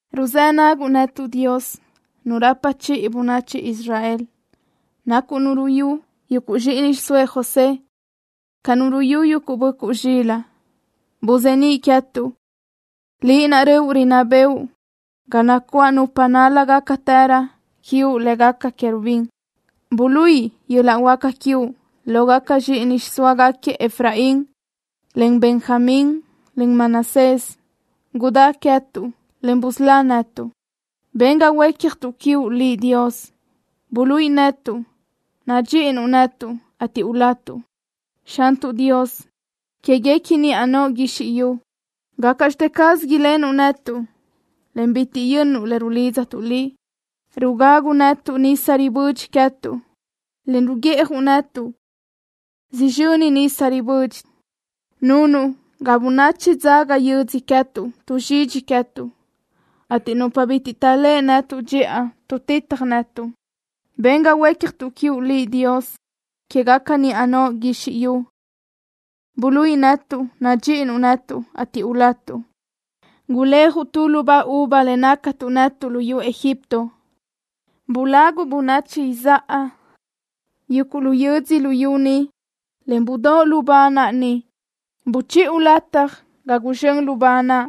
Ruzë́ naguʼ netuʼ, Dios, Nu rapa chiʼi bönachi Israel. Nacuʼ Nu ruyú yuguʼ zxíʼini xiʼsóëʼ José ca nu ruyú yuguʼ böʼcuʼ zxilaʼ. Buzeníʼ queë́tuʼ, Liʼ naʼ röʼu rinná bëʼu ga nacuáʼ nupa nál-lágacatërö quiuʼ lë́gaca querubín. Buluíʼi yöl-laʼ huáca quiuʼ lógaca zxíʼini xiʼsóagaquiëʼ Efraín, en Benjamín, en Manasés. Gudá queë́tuʼ, en busölá netuʼ. Ben ga huécjatuʼ quiuʼ Liʼ, Dios. Buluíʼi netuʼ nadxíʼinuʼ netuʼ, ateʼ ulatuʼ. Xantuʼ Dios quéguequi niʼa noʼo guizxi yu, ¿gácaʼxte caz ilenuʼ netuʼ, en bitiʼ yönnuʼ le rulidztuʼ Liʼ? Rugaguʼ netuʼ nisa ribödxi queë́tuʼ, en ruguiʼjuʼ netuʼ sizxöni nisa ribödxi. Nunuʼ ga bönachi dzaga yödzö queë́tuʼ tuʼzxidxi queë́tuʼ, ateʼ nupa bitiʼ taʼléʼe netuʼ dxiʼa tuʼtitaj netuʼ. Ben ga huécjatuʼ quiuʼ Liʼ, Dios quégaca niʼa noʼo guizxi yu. Buluíʼi netuʼ nadxíʼinuʼ netuʼ, ateʼ ulatuʼ. Guléajuʼ tu lubá uva le nácatuʼ netuʼ luyú Egipto. Bulaguʼ bönachi izáʼa yuguʼ lu yödzö luyú ni, en budóʼo lubá naʼ ni. Buchiʼu lataj ga guzxö́n lubá naʼ.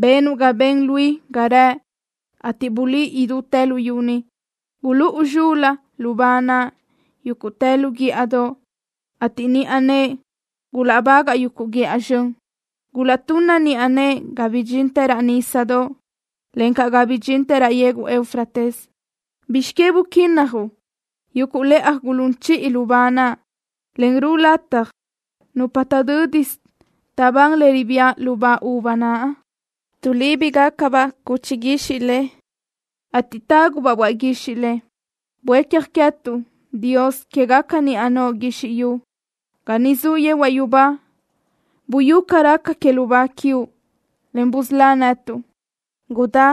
Benuʼ ga ben luí ga rëʼ, ateʼ bulí idútë luyú ni. Gulúʼu zxul-la lubá naʼ yúguʼtë lu guíʼadoʼ, ateʼ niʼa nëʼe gulaʼbagaʼ yuguʼ guíʼa zxön. Gulaʼtunna niʼa nëʼe ga bidxintë raʼ nísadoʼ, encaʼ ga bidxintë raʼ yegu Eufrates. ¿Bizx que buquínnajuʼ yuguʼ lëʼaj gulún chiʼi lubá naʼ, en ruʼu lataj nupa taʼdö́disö taʼbán le ribía lubá uva naʼ? Tuʼlíbigacabaʼ cuchi guixiʼ le, ateʼ tágubaʼ böaʼ guixiʼ le. Buécja queë́tuʼ, Dios quégaca niʼa noʼo guizxi yu. Ga niʼ zuʼ yehuaʼ yubá buyú ca raca que lubá quiuʼ, en busölá netuʼ. Gudá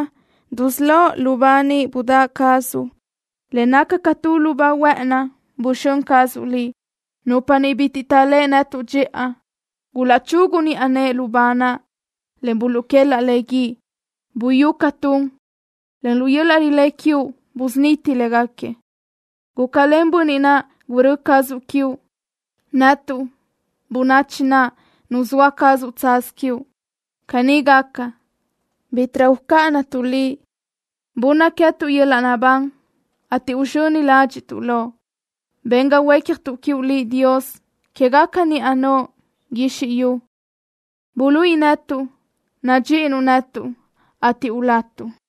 dusölóʼ lubá ni budáʼ cazuʼ, le naca ca tu lubá huë́ʼëni buxö́n cazuʼ Liʼ. Nupa bitiʼ taʼléʼe netuʼ dxiʼa gulaʼchugu niʼa nëʼe lubá naʼ, en buluʼquelaʼ le guíʼ. Buyú ca tun, en lu yöl-laʼ rilé quiuʼ busuniti léguequi. Gúcalen bönniʼ naʼ gurö́ cazuʼ quiuʼ, netuʼ, bönachi naʼ nuzóa cazuʼ tsaz quiuʼ. Caní gaca, bítiʼrö ucáʼanatuʼ Liʼ. Bunna queë́tuʼ yöl-laʼ naʼbán, ateʼ uzxöni ládxiʼtuʼ Loʼ. Ben ga huécjatuʼ quiuʼ Liʼ, Dios quégaca niʼa noʼo guizxi yu. Buluíʼi netuʼ nadxíʼinuʼ netuʼ, ateʼ ulatuʼ.